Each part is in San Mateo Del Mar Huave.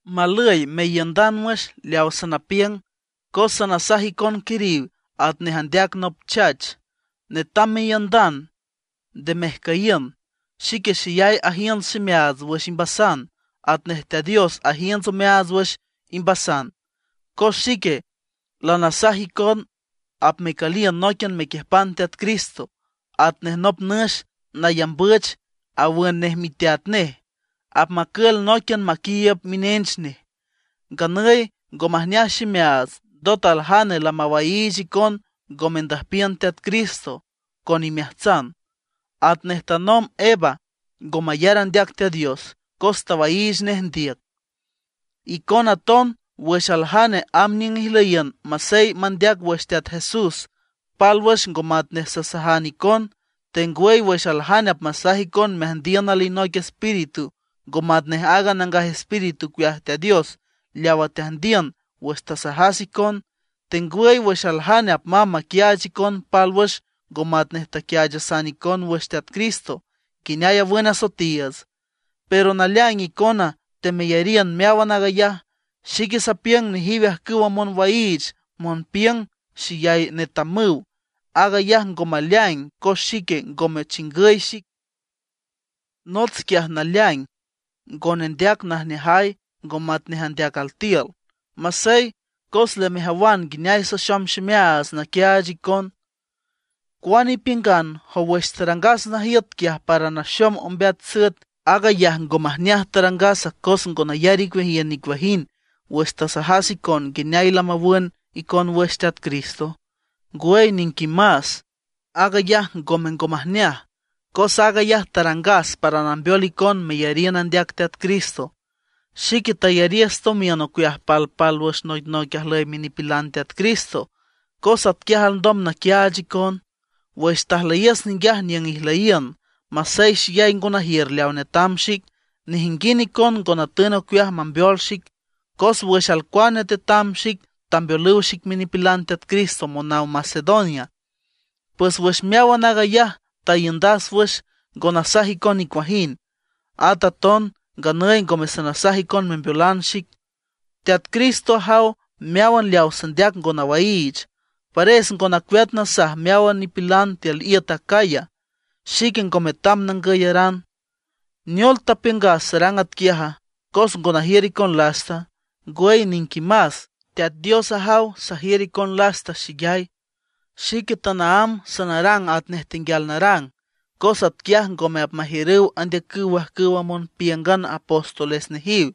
Malüy meiündan wüx leaw sanapiüng, cos sanasaj icon quiriw atnej andeac nop chach. Netam meiündan, nde mejcüyiün. Xique xeyay ajiünts ximeaats wüx imbasan, atnej Teat Dios ajiünts omeaats wüx imbasan. Cos xique lanasaj icon apmecüliün nóiquian mequiüjpan Teat Cristo, atnej nop nüx nayambüch, awün nej miteat nej, apmacül nóiquian maquiiüb minench nej. Nganüy ngo majneaj ximeaats, ndot aljane lamawaiich icon ngo mendüjpiün Teat Cristo con imeajtsan, atnej tanomb Eva ngo mayar andeac Teat Dios, cos tawaiich nej ndiüc. Icona aton wüx aljane amb niüng ijlüyiün, masey mandeac wüx Teat Jesús pálwüx ngo matnej sasajan icon; tengwüy wüx aljane apmasaj icon meajndiün alinoic espíritu ngo matnej aaga Nangaj Espíritu ocueaj Teat Dios leaw teajndiün wüx tasajasan icon; tengwüy wüx aljane apmamb maquiaach icon pálwüx ngo matnej taquiaachasan icon wüx Teat Cristo nguineay awün asoetiiüts, pero naleaing icona temeyariün meáwan aag ayaj. Xique sapiüng nejiw ajcüwa monwaiich monpiüng xeyay netamüw, aag ayaj ngo maleaing cos xique ngome chingüy xic. Nots quiaj naleaing ngo nendeac najneajay ngo matnej andeac altiül. Masey, cos lamejawan nguineay saxom ximeaats naquiaach icon. ¿Cuane ipiüngan, jow wüx tarangas najiüt quiaj para naxom ombeat süet, aag ayaj ngo majneaj tarangas cos ngo nayar icueajiün nicuajind wüx tasajas icon nguineay lamawün icon wüx Teat Cristo? Ngwüy niquimas, aag ayaj ngome ngo majneaj, cos aag ayaj tarangas para nambeol icon meyariün andeac Teat Cristo. Xique tayariüs tomiün ocueaj palpálwüx noicnoic ajlüy minipilan Teat Cristo, cos atquiaj alndom naquiaach icon. Wüx tajlüyiüs ninguiaj niüng ijlüyiün masey xeyay ngo najiür leaw tetam xic, nejinguind icon ngo natün ocueaj mambeol xic. Cos wüx alcuane tetam xic tambeolüw xic minipilan Teat Cristo monaw Macedonia. Pues wüx meáwan aag ayaj taiündas wüx, ngo nasaj icon nicuajind. At aton nganüy ngome sanasaj icon membeolan xic. Teat Cristo ajaw meáwan leaw sandeac ngo nawaiich, pares ngo nacueat nasaj meáwan nipilan tiül iüt Acaya, xique ngo metam nangüyaran. ¿Neol tapiüngas sarang atquiaja, cos ngo najiür icon lasta? Ngwüy niquimas, Teat Dios ajaw sajiür icon lasta xeyay. Xique tanaámb sanarang atnej tenguial narang, cos atquiaj ngome apmajiürüw andeacüw ajcüwa monpíüngan apóstoles nejiw,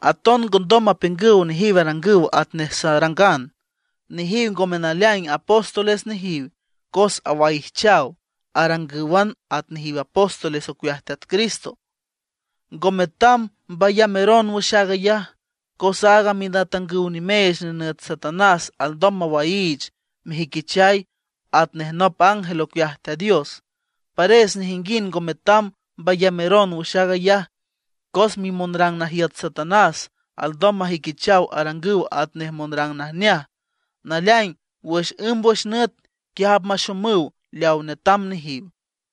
aton ngondom mapiüngüw nejiw arangüw atnej sarangan. Nejiw ngome naleaing apóstoles nejiw, cos awaijchaw, arangǘwan at nejiw apóstoles ocueaj Teat Cristo. Ngo metam mbayameron wüx aag ayaj, cos aaga minatangüw nimeech nenüt Satanás alndom mawaiich mejüiquichay atanej nop ángel ocueaj Teat Dios. Pares nejinguind ngo metam mbayameron wüx aag ayaj, cos mimonrang najiüt Satanás alndom majüiquichaw arangüw atnej monrang najneaj. Naleaing wüx ǘmbwüx nüt, quiaj apmaxomüw leaw netam nejiw.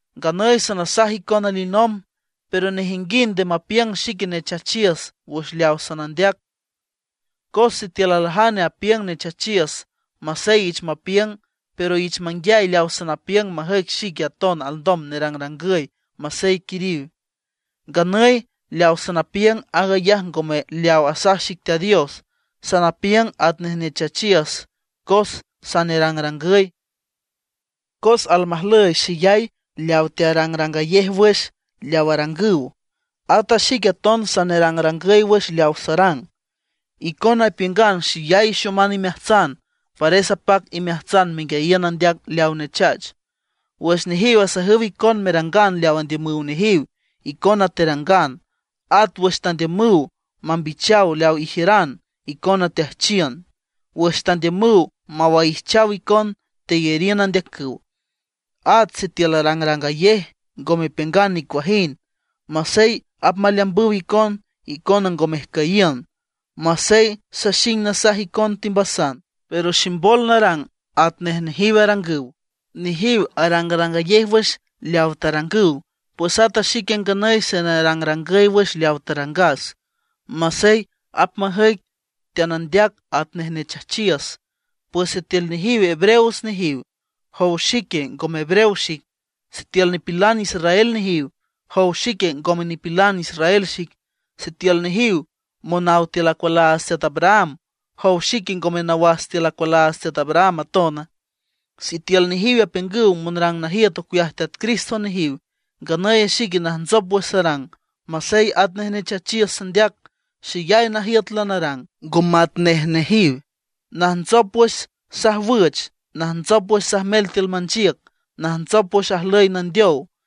Nganüy sanasaj icon alinomb, pero nejinguind nde mapiüng xique nechachiüs wüx leaw sanandeac. Cos sitiül aljane apiüng nechachiüs, masey ich mapiüng, pero ich manguiay leaw sanapiüng majüic xique aton alndom nerangrangüy, masey quiriw. Nganüy leaw sanapiüng aag ayaj ngome leaw asaj xic Teat Dios; sanapiüng atnej nechachiüs cos sanerangrangüy. Cos almajlüy xeyay leaw tearangrangayej wüx leaw arangüw, ata xique aton sanerangrangüy wüx leaw sarang. Icona ipiüngan xeyay ixoman imeajtsan, pares apac imeajtsan menguiayiün andeac leaw nechach. Wüx nejiw asajüw icon merangan leaw andiümüw nejiw, icona terangan. At wüx tandiümüw mambichaw leaw ijiüran, icona teajchiün. Wüx tandiümüw mawaijchaw icon, teyariün andeacüw. At sitiül arangrangayej, ngo mepiüngan nicuajind. Masey apmaleambüw icon, icona ngo mejcüyiün. Masey saxing nasaj icon timbasan, pero ximbol narang atnej nejiw arangüw. Nejiw arangrangayej wüx leaw tarangüw. Pues ata xique nganüy sanerangrangüy wüx leaw tarangas, masey apmajüic teanandeac atnej nechachiüs. Pues sitiül nejiw hebreos nejiw, ¿jow xique, ngome hebreo xic? Sitiül nipilan israel nejiw, ¿jow xique, ngome nipilan israel xic? Sitiül nejiw monaw tiül acualaats teat Abraham, ¿jow xique, ngome nawas tiül acualaats teat Abraham atona? Sitiül nejiw apiüngüw monrang najiüt ocueaj Teat Cristo nejiw, nganüy xique najntsop wüx sarang, masey atnej nechachiüs sandeac. Xeyay najiüt lanarang, ngo matnej nejiw. Najntsop wüx sajwüch, najntsop wüx sajmel tiül manchiüc, najntsop wüx ajlüy nandeow.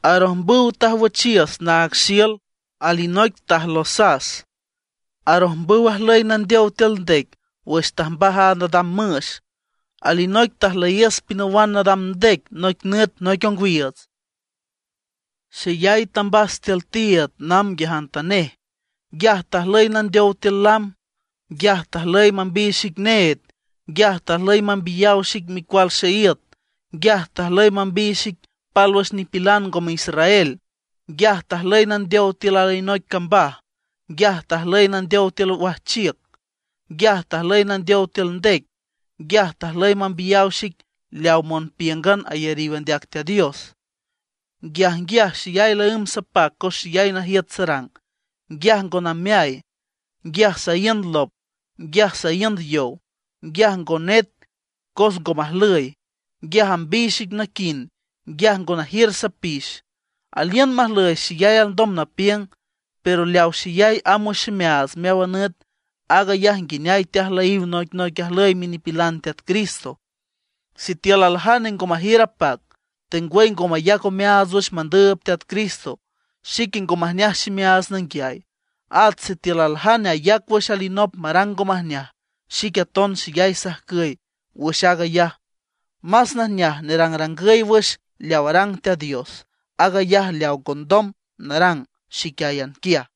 Arojmbüw tajwüchiüs naag xiül. Alinoic tajlosas. Arojmbüw ajlüy nandeow tiül ndec wüx tajmbaj a nadam müx. Alinoic tajlüyiüs pinawan nadam ndec noic nüt noic ongwiiüts. Xeyay tambas tiül tiiüd namb nguiajantanej. Nguiaj tajlüy nandeow tiül lam. Nguiaj tajlüy mambiy xic need. Nguiaj tajlüy mambiyaw xic micual xeíüt. Nguiaj tajlüy mambiy xic pálwüx nipilan ngome israel. Nguiaj tajlüy nandeow tiül alinoic cambaj. Nguiaj tajlüy nandeow tiül wajchiüc. Nguiaj tajlüy nandeow tiül ndec. Nguiaj tajlüy mambiyaw xic leaw monpíüngan ayariw andeac Teat Dios. Nguiajnguiaj xeyay laǘmb sapac cos xeyay najiüt sarang. Nguiaj ngo nameay, nguiaj saíünd lop, nguiaj saíünd yow, nguiaj ngo net cos ngo majlüy, nguiaj ambiy xic naquind, nguiaj ngo najiür sapix. Aliün majlüy xeyay alndom napiüng, pero leaw xeyay amb wüx ximeaats meáwan nüt, aag ayaj nguineay teajlüyiw noicnoic ajlüy minipilan Teat Cristo. Sitiül aljane ngo majiür apac, tengwüy ngo mayac omeaats wüx mandüüb Teat Cristo, xique ngo majneaj ximeaats nanguiay. At sitiül aljane ayac wüx alinop marang ngo majneaj, xique aton xeyay sajcüy wüx aag ayaj. Más najneaj nerangrangüy wüx leaw arang Teat Dios, aag ayaj leaw ngondom narang xiquiáyan quiaj.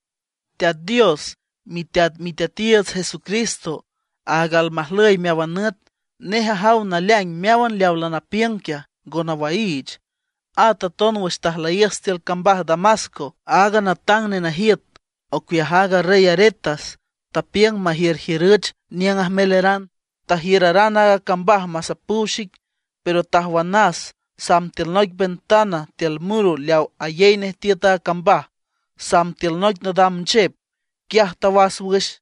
Teat Dios, miteat Miteatiiüts Jesucristo, aaga almajlüy meáwan nüt, nej ajaw naleaing meáwan leawa lanapiüng quiaj, ngo nawaiich. At aton wüx tajlüyiüs tiül cambaj Damasco, aaga natang nenajiüt ocueaj aaga rey Aretas tapiüng majiürjiürüch niüng ajmeleran. Tajiüraran a cambaj masapüw xic. Pero tajwanas samb tiül noic ventana tiül muro leaw ayey nej tiüt a cambaj. Samb tiül noic nadam nchep, quiaj tawas wüx.